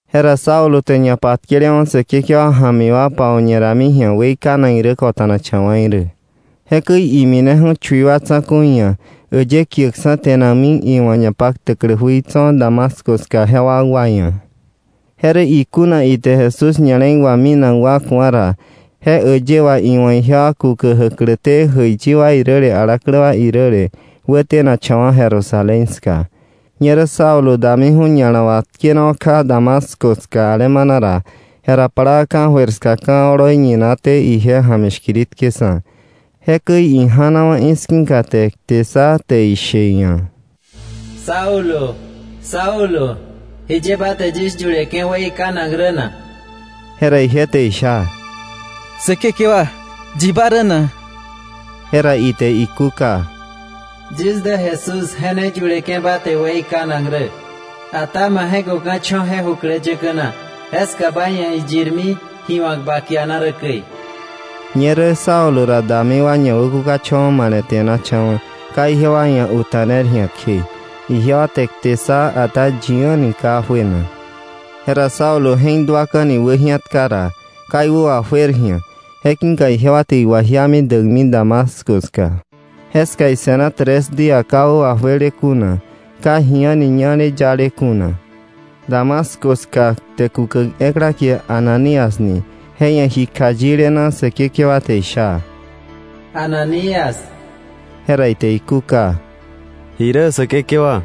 Jera Saulo te ñapatkelewa̱ Säkekewa ja̱mi wa pau̱ñe rami ji̱a weikanak irä kota̱nakcha̱wa̱ irä. Jekäi imineju̱ chui wa tsa̱ku̱i ia̱, äyë kiäkksa̱ te̱nakmi iwa̱ ñapaktäklä jui tso̱ Damasco ska je wakwa ia̱. Je rä ikuna ite Jesús ña̱le̱i wà minak wa ku̱a ra, je äyë wà iwa̱ ijewa kukä jäkläté jäiyi wa iräle, alaklä wa iräle, wätenakcha̱wa̱ Jerusalén ska. Ñerä Saulo damiju̱ ña̱la wà tkenawa̱ kja Damasco ska alemana ra, jera plaa ka̱jöir ska ka̱ oloi ñinaté ije ja̱mi shkiritkeksa̱. Jekäi ija̱nawa̱ i̱ski̱ka, te kte ssa, te ishe iia̱: —Saulo, Saulo, ¿jiye ba te yis yuleke̱ weikanak rä na? Jera ije te isha: —Säkekewa, ¿yi ba rä na? Jera ite ikúka: —Yis dä Jesús je ne yuleke̱ ba te weikanak rä. Ata ba je̱köka̱ cho̱ je jukläyäkä na. Jeska ba ia̱ iyirmi ji wa̱k ba kiana rä käi. Ñerä Saulo ra dami wa ñawäkukacha̱wa̱ male̱te̱nacha̱wa̱, ka ijewa ia̱ uta̱ner ji̱a kje. Ijewa te kte ssa, ata yi a̱ni ka juena. Jera Saulo je̱k duaka̱ni wäji̱atka ra, ka iwä wajuer ji̱a. Je ki̱ka ijewa te iwajiami däkmi Damasco ska. Jeska ise̱na tres día ka wä wajuele kuna, ka ji a̱ni ñale yale kuna. Damasco ska kte kukäk ekla kie Ananías ni je ia̱ ji kjayile na Säkekewa te isha: —¡Ananías! Jera ite ikúka: —¿Ji irä Säkekewa?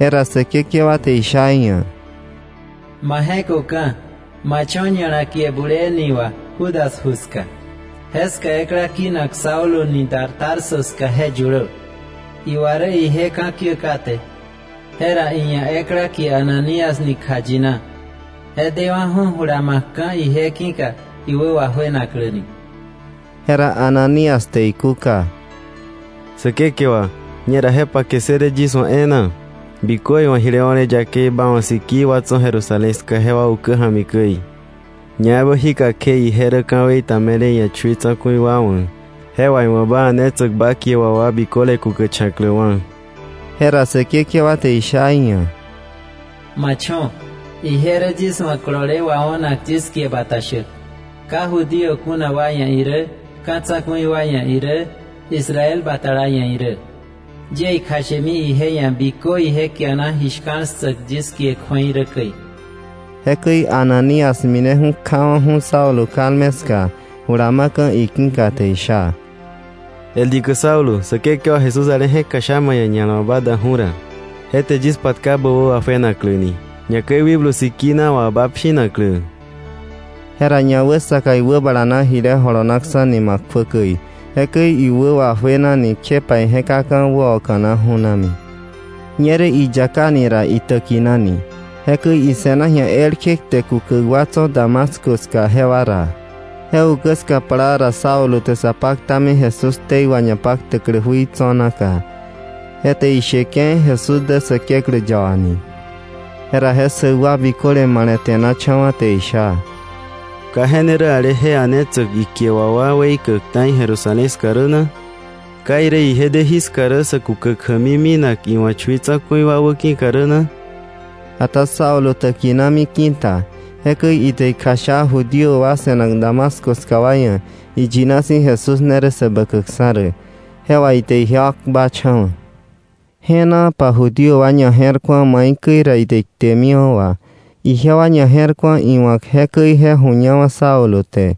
Jera Säkekewa te isha iia̱: —Ma je̱köka̱, ma cho̱ ña̱la kie Bulee ni wà Judas ju ska. Jeska ekla kinak Saulo ni dar Tarso ska je yulö. Iwa rä ije ka̱kiä kate, jera iia̱ ekla kie Ananías ni kjayina je dewa̱ju̱ jula ma̱kka̱ ije ki̱ka iwä wajuenakläni. Jera Ananías te ikúka: —Säkekewa, ñera je pake ssële yis wa̱ e̱e̱na, bikö iwa̱ jile o̱le yakei ba wa̱ sikii wa tso̱ Jerusalén ska jewa ukä ja̱mi käi. Ñaebä jíka kje ije rä ka̱wei ta me̱le iia̱ chui tsa̱ku̱i wa wa̱, je wà iwa̱ ba a̱netsäk ba kie wà wa biköle kukächa̱kläwa̱. Jera Säkekewa te isha iia̱: —Ma cho̱. Ije rä yis wa̱ kolole wao̱nak, yis kie bata shäk, ka Judío kuna wa ia̱ irä, ka̱ tsa̱ku̱i wa ia̱ irä Israel batala ia̱ irä. Yie ikjashemi je ia̱ bikö ije kiana ji shka̱l ssäk yis kie kju̱ei rä käi. Jekäi Ananías mineju̱ kjawa̱ju̱ Saulo kalme ska, jula ma̱ka̱ iki̱ka, te isha: —El dikä Saulo, Säkekewa Jesús ale je̱k kjasha ma ia̱ ña̱la wà ba daju̱ ra, je te yis patka bä wä wajuenakläni, ñakäi Wikblu Sikina wa ba pshinaklä. Jera ñawäsaka iwäbala na jile jolonaksa̱ nima kjuä käi, jekäi iwä wajuenani kjepa ije̱kaka̱ wäoka̱na ju̱nami. Ñerä iyakani ra, itäkinani. Jekäi ise̱na ji̱a elkje kte kukäk wa tso̱ Damasco ska jewa ra. Je ukä ska plaa ra Saulo te sa paktami Jesús ktei wà ñapaktäklä jui tso̱ naka. Je te isha: —Ije rä Säkeklä yaba. Jera je ssäk wa biköle male̱te̱nacha̱wa̱ te isha: —¿Ka je ne rä ale je a̱netsäk ikie wà wa weikäk ta̱i Jerusalén ska rä na? ¿Ka irä ije de jiska rä sä kukäk jämi minak iwa̱ chui tsa̱ku̱i wa wäki̱ rä na? Ata Saulo täkinami ki̱ta. Jekäi ite ikjasha Judío wa se̱nak Damasco ska wa ia̱ iyina si̱ Jesús ne rä Säbäkäkksa̱ rä. Je wà ite ijewa kpacha̱wa̱. Jenaapa Judío wa ñaje̱rku̱a maikäi ra ite iktemiwa̱ wà. Ijewa ñaje̱rku̱a iwa̱k jekäi je ju̱ñawa̱ Saulo te.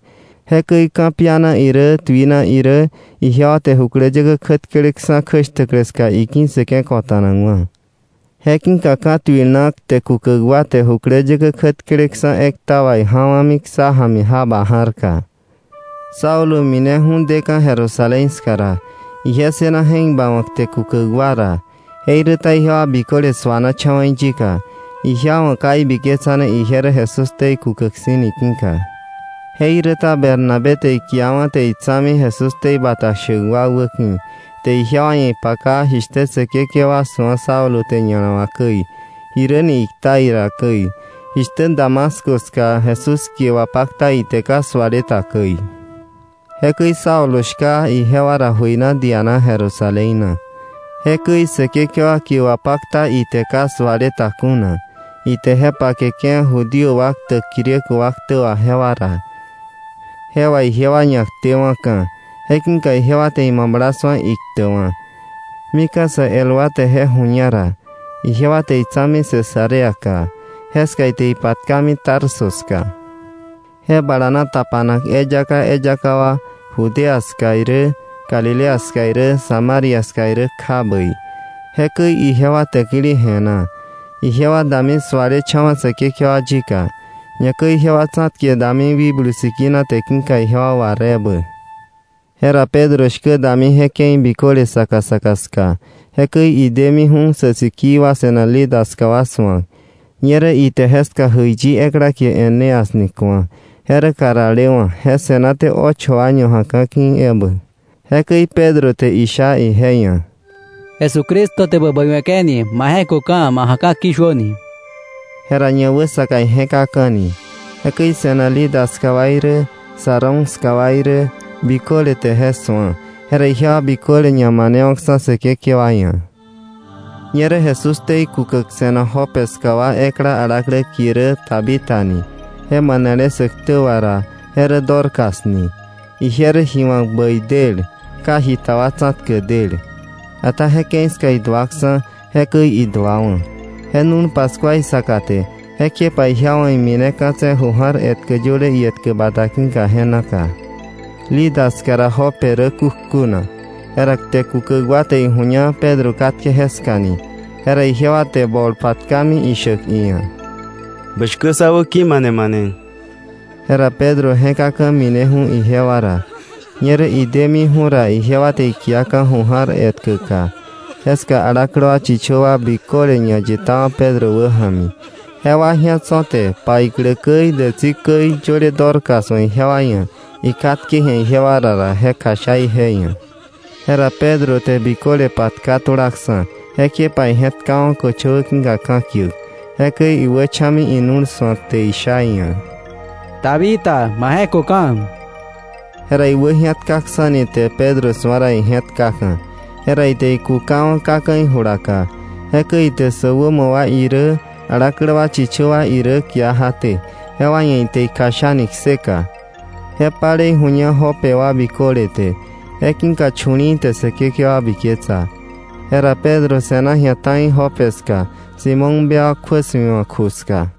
Jekäi ka̱piana irä tuina irä ijewa te jukläyäkä kjätkeleksa̱ kjäshtäklä ska iki̱ssëke̱ ko̱ta̱nakwa̱. Je ki̱ka ka̱tuil na kte kukäk wa te jukläyäkä kjätkeleksa̱ ekta wa ija̱wa̱mi ksá ja̱mi jaba ja̱rka. Saulo mineju̱ deka̱ Jerusalén ska ra, ije ssëna je̱k bawa̱k kte kukäk wa ra. Jeiräta ijewa biköle su̱anacha̱wa̱ iyika, ijewa wa̱ ka ibiketsane ije rä Jesús ktei kukäk si̱ ki̱ka. Jeiräta Bernabé te ikiawa̱ te itsa̱mi Jesús ktei bata shäk wa wäki̱, te ijewa ia̱ ipaka jishtä Säkekewa su̱a Saulo te ña̱la wà käi, jiräni ikta ira käi, jishtä Damasco ska Jesús kie wapakta ite ka suale ta käi. Jekäi Saulo shka ijewa ra jöina diana Jerusalén na. Jekäi Säkekewa kie wapakta ite ka suale ta kuna, ite je pakeke̱ Judío wa ktäk Griego wa ktä wà jewa ra, je wà ijewa ñaktewa̱ka̱. Je ki̱ka ijewa te imabla su̱a iktäkwa̱. Mika̱ sä el wa te je ju̱ña ra, ijewa te itsa̱mi Cesareaka. Jeska ite ipatkami Tarso ska. Je balana tapanak eyaka eyaka wa Judea ska irä, Galilea ska irä, Samaria ska irä, kja bäi. Jekäi ijewa täkili je̱na. Ijewa dami sualecha̱wa̱ Säkekewa yika, ñakäi ijewa tsa̱tke dami Wikblu Sikina te ki̱ka ijewa war ebä. Jera Pedro shkä dami je ke̱i biköle saka saka ska. Jekäi idemiju̱ sä sikii wa se̱nak Lida ska wa su̱ak. Ñerä ite jeska jäiyi ekla kie Eneas ni ku̱a. Je rä karalewa̱. Je se̱naté ocho año ja̱ka̱ ki̱ ebä. Jekäi Pedro te isha ije ia̱: —Jesucristo te bä bäiwe̱ke̱ni. Ma jeköka̱; ma ja̱ka̱ ki̱shuöni. Jera ñawäsaka ije̱kaka̱ni. Jekäi se̱nak Lida ska wa irä Sarón ska wa irä biköle te je su̱a, jera ijewa biköle ñamanewa̱kksa̱ Säkekewa ia̱. Ñerä Jesús ktei kukäk se̱nak Jope ska wa ekla alaklä kie rä Tabita ni. Je manelé sä ktä wà ra, je rä Dorcas ni. Ije rä ji wa̱k bäi del, ka jita wa tsa̱tkäk del. Ata je ke̱i ska iduaksa̱, jekäi iduawa̱. Je nu̱l paskua isaka te, jekjepa ijewa wa̱ imineka̱tse̱ ju ja̱r etkä yöle ietkä bata ki̱ka je naka. Lida ska ra Jope rä kukjuna. Jera kte kukäk wa te ijuña Pedro katke jeska ni, jera ijewa te bol patkami ishäk iia̱: “Bä shkä sá wäki̱ mane mane.” Jera Pedro je̱kaka̱ mineju̱ ijewa ra. Ñerä idemiju̱ ra, ijewa te ikiaka̱ ju ja̱r etkäka. Jeska alaklä wa chichö wa biköle ñayitawa̱ Pedro wäja̱mi. Jewa ji̱a tso̱, te paiklä käi dätsi käi, yöle Dorcas wa̱ ijewa ia̱ ikatke ji̱a ijewa ra ra, je kjasha ije ia̱. Jera Pedro te biköle patka tulaksa̱. Jekjepa ije̱tkawa̱ köchöwä ki̱ka ka̱kiäk. Jekäi iwächa̱mi inu̱l su̱ak te isha iia̱: —¡Tabita, ma je̱köka̱! Jera iwäji̱atkaksa̱ni te Pedro su̱a ra, ije̱tkaka̱. Jera ite ikukawa̱ kaka̱ ijulaka. Jekäi ite sä sikii wa irä alaklä wa chichö wa irä kia jaté, jewa ia̱ ite ikjashani kseka. Je palei ju̱ña Jope wa biköle te. Je ki̱ka chu̱li̱i̱ te Säkekewa biketsa. Jera Pedro se̱na ji̱a ta̱i Jope ska Simón bewak kjuä su̱iwa̱k ju ska.